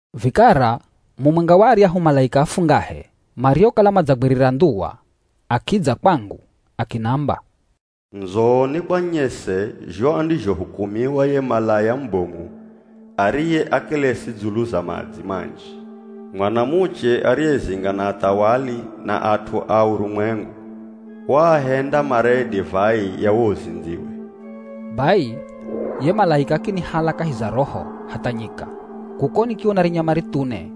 Vikara mumwenga wa aryahu malaika afungahe mariokala madzagwirira ndhuwa akidza kwangu akinamba, “Ndzo nikwanyese zho andizhohukumiwa ye malaya mubomu ariye akelesi dzulu za madzi manji. Mwanamuche ariyezinga na athawali na at'u a urumwengu, waahenda maree divai ya wo uzindziwe.” Bai ye malaika akinihala kahi za Roho hatha nyika. Kuko nikiona rinyama rithune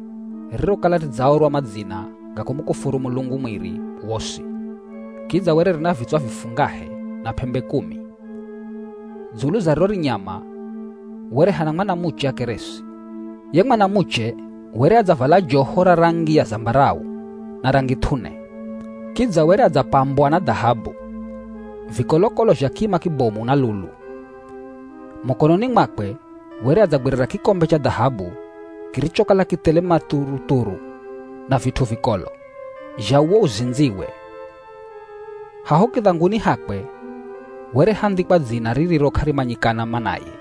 ririrokala ridzaorwa madzina ga kumukufuru Mulungu mwiri wosi. Kidza were rina vitswa vifungahe na p'embe kumi. Dzulu za riro rinyama were hana mwanamuche akeresi. Ye mwanamuche were adzavala joho ra rangi ya zambarau na rangi th'une. Kidza were adzapambwa na dhahabu, vikolokolo zha kima kibomu na lulu. Mukononi mwakwe were adzagwirira kikombe cha dhahabu kirichokala kithele mathuruthuru na vit'u vikolo, zha uwo uzindziwe. Haho kidhanguni hakwe were handhikwa dzina ririro k'arimanyikana manaye.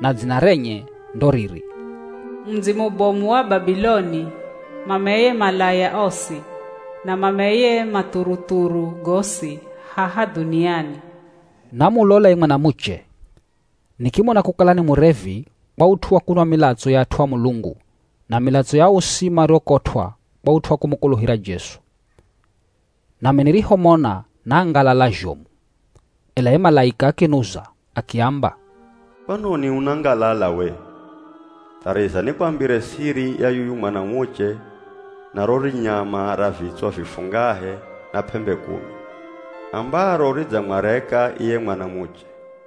Na dzina renye ndo riri, “MUDZI MUBOMU WA BABILONI, MAMEYE MALAYA OSI, na MAMEYE MATHURUTHURU GOSI HAHA DHUNIANI.” Namulola ye mwanamuche, nikimona kukala ni murevi kwa ut'u wa kunwa milatso ya at'u a Mulungu na milatso ya osi mariokotw'a kwa ut'u wa kumukuluhira Jesu. Nami nirihomona nangalala zhomu. Ela ye malaika akinuza akiamba, “Kwanoni unangalala we? Thariza nikwambire siri ya yuyu mwanamuche na ro rinyama ra vitswa vifungahe na p'embe kumi, ambaro ridzamwareka iye mwanamuche.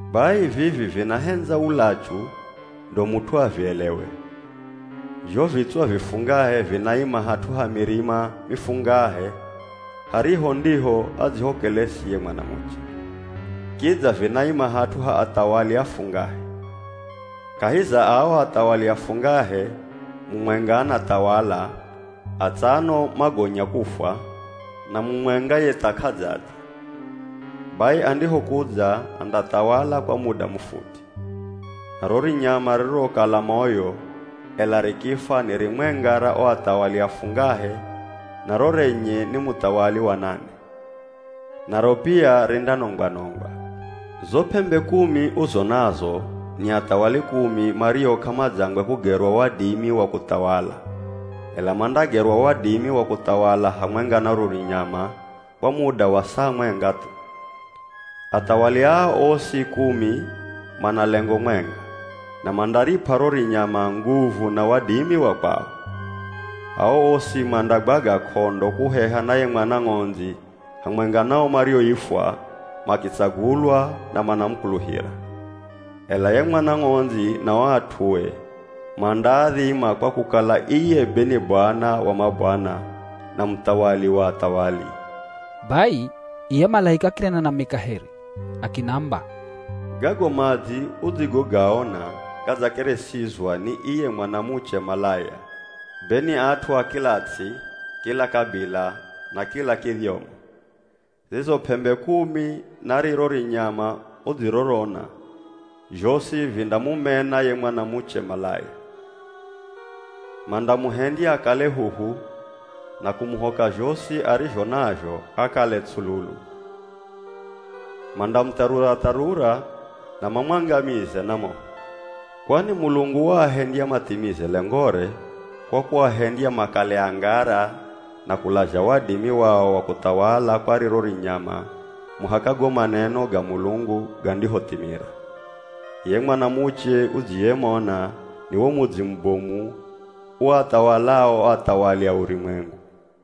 “Bai vivi vinahendza ulachu ndo mut'u avielewe. Zho vitswa vifungahe vinaima hat'u ha mirima mifungahe hariho ndiho adzihokeresi ye mwanamuche. Kidza vinaima hat'u ha athawali afungahe. Kahi za ao athawali afungahe, mumwenga anathawala, atsano magonya kufwa, na mumwenga ye tha k'adzadza. Bai andihokudza andathawala kwa muda mufuti. Na ro rinyama ririrokala moyo, ela rikifwa ni rimwenga ra o athawali afungahe na ro renye ni muthawali wa nane. Naro pia rindanongwa-nongwa. “Zo p'embe kumi uzonazo ni athawali kumi mario k'amadzangwe kugerwa wadimi wa kuthawala, ela mandagerwa wadimi wa kuthawala hamwenga na ro rinyama kwa muda wa saa mwenga thu. Athawali aa osi kumi mana lengo mwenga, na mandarip'a ro rinyama nguvu na wadimi wa kwao. Aa osi mandagwaga k'ondo kuheha na ye Mwana Ng'ondzi hamwenga na o marioifwa, makitsagulwa na manamukuluhira. Ela ye Mwana Ng'ondzi na o at'ue, mandaadhima kwa kukala iye be ni Bwana wa mabwana, na Muthawali wa athawali.” Bai iye malaika akinena nami kaheri akinamba, “Gago madzi udzigogaona gadzakeresizwa ni iye mwanamuche malaya, be ni at'u a kila ts'i, kila kabila, na kila kidhyomo. Zizo p'embe kumi na riro rinyama udzirorona, zhosi vindamumena ye mwanamuche malaya. Mandamuhendya akale huhu na kumuhoka zhosi arizho nazho akale tsululu. Mandamutharura-tharura na mamwangamize na moho. Kwani Mulungu waahendya mathimize lengore, kwa kuahendya makale angara na kulazha wadimi wao wa kuthawala kwa riro rinyama muhaka go maneno ga Mulungu gandihothimira. Iye mwanamuche udziyemona, ni wo mudzi mubomu uathawalao o athawali a urumwengu.”